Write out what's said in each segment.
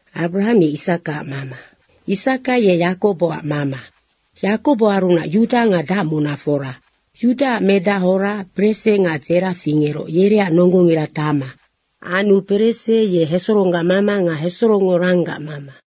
Abrahang ye Isakaac mama. Isaka ye Yakoboac mama. Yakoboarunac Yuda nga dacmunafora. Yudaac medahora Perese nga Dzera fingeroc, yereac nonggongira Tama. Anu Perese ye Hesoronggac mama nga Hesorongngo Ranggac mama.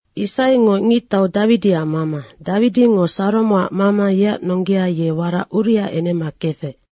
Isaingo ngictau Dawidiac mama, Dawidingo Saromoac mama yeac nonggea ye warac Uriaac enema kefec.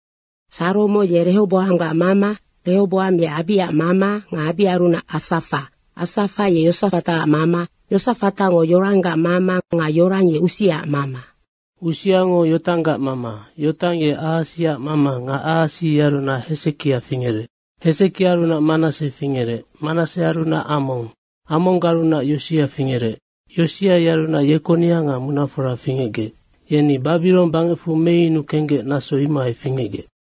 Saromo ye Rehoboanggac mama, Rehoboang ye Abiaac mama nga Abiaarunac Asafa. Asafa ye Yosafataac mama, Yosafatango Yoranggac mama nga Yorang ye Usiaac mama. Usiango Yotanggac mama, Yotang ye Ahasiac mama nga Ahasi yearunac Hesekia fingerec. Hesekiaarunac Manasse fingerec, Manassearunac Among, Amonggarunac Yosia fingerec. Yosia yearunac Yekonia nga munafora fingecgec. Yeni Babirong bangecfu meyunu kenggec, naso imohai fingecgec.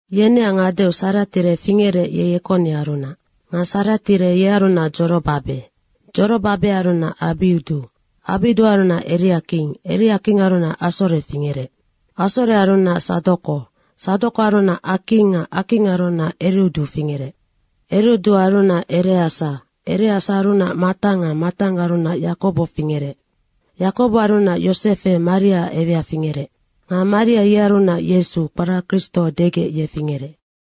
Yeneac ngadeu Saratiere fingerec, ye Yekoniarunac. Nga Saratiere yearunac Dzorobabe. Dzorobabearunac Abiudu, Abiuduarunac Eriaking, Eriakinggarunac Asore fingerec. Asorearunac Sadoko, Sadokoarunac Aking nga Akinggarunac Eriudu fingerec. Eriuduarunac Ereasa, Ereasaarunac Matang nga Matanggarunac Yakobo fingerec. Yakoboarunac Yosefe Mariaac ewea fingerec. Nga Maria yearunac Yesu, kpara Kristo degec, ye fingerec.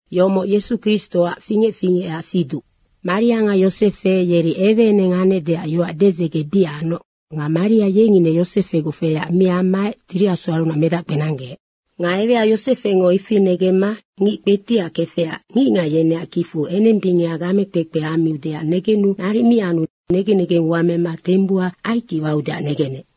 Yomoc Yesu Kristoac fingec fingecac siduc. Maria nga Yosefe yeri eweeneng anecdeac yoac dedzege bic anoc nga Maria yeng ine Yosefegoc feyac mi ammaec Tiri Asuarunac medac kpenanggeec. Nga ewea Yosefengo ifi negemma ngic kpetiac kefecac ngicngac yeneac kicfu enembingeha gamekpekpe ammiudeac negenu naric mi anu negen negengua mema tembuhau aikic waudeac negenec.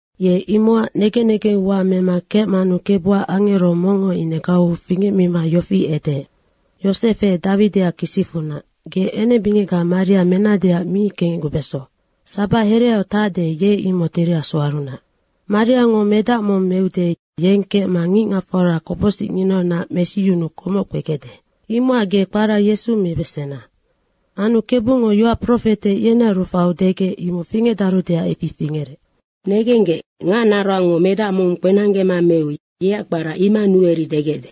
Ye imocac negen negengua mema kecmanu Kebuac angero mongngo ine gauu fingecmima yofi edeec, “Yosefe, Dawidiac kisicfunac, ge enembingecga Maria menadeac mi kengecgubeso. Sabac hereau tacde, ye imoc Tiri Asuarunac. Mariango medac mong meude, yeng kecma ngicngacfora kopocsinginaunac mesiyunuu komoc kpegecde. Imocac ge kpara Yesu mibesena.” Anu Kebungo yoac profete yenearu faiu degec, imocnoc fingecdarudeac ifi fingerec. “Negenggec, ngacnaroangngo medac mong kpenanggema meu yeac kpara Imanuere degecde.”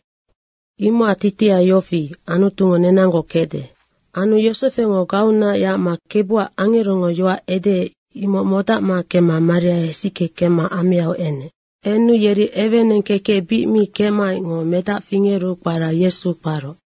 Imocac titiha yofi, Anutungo nenanggoc kecde. Anu Yosefengo gauunac yacma Kebuac angerongo yoac edeec, imoc modacma kemma Maria hesickema ameau enec. Enu yeri eweeneng kekec bic mi kecmaecngoc medac fingeru kpara Yesu kparoc.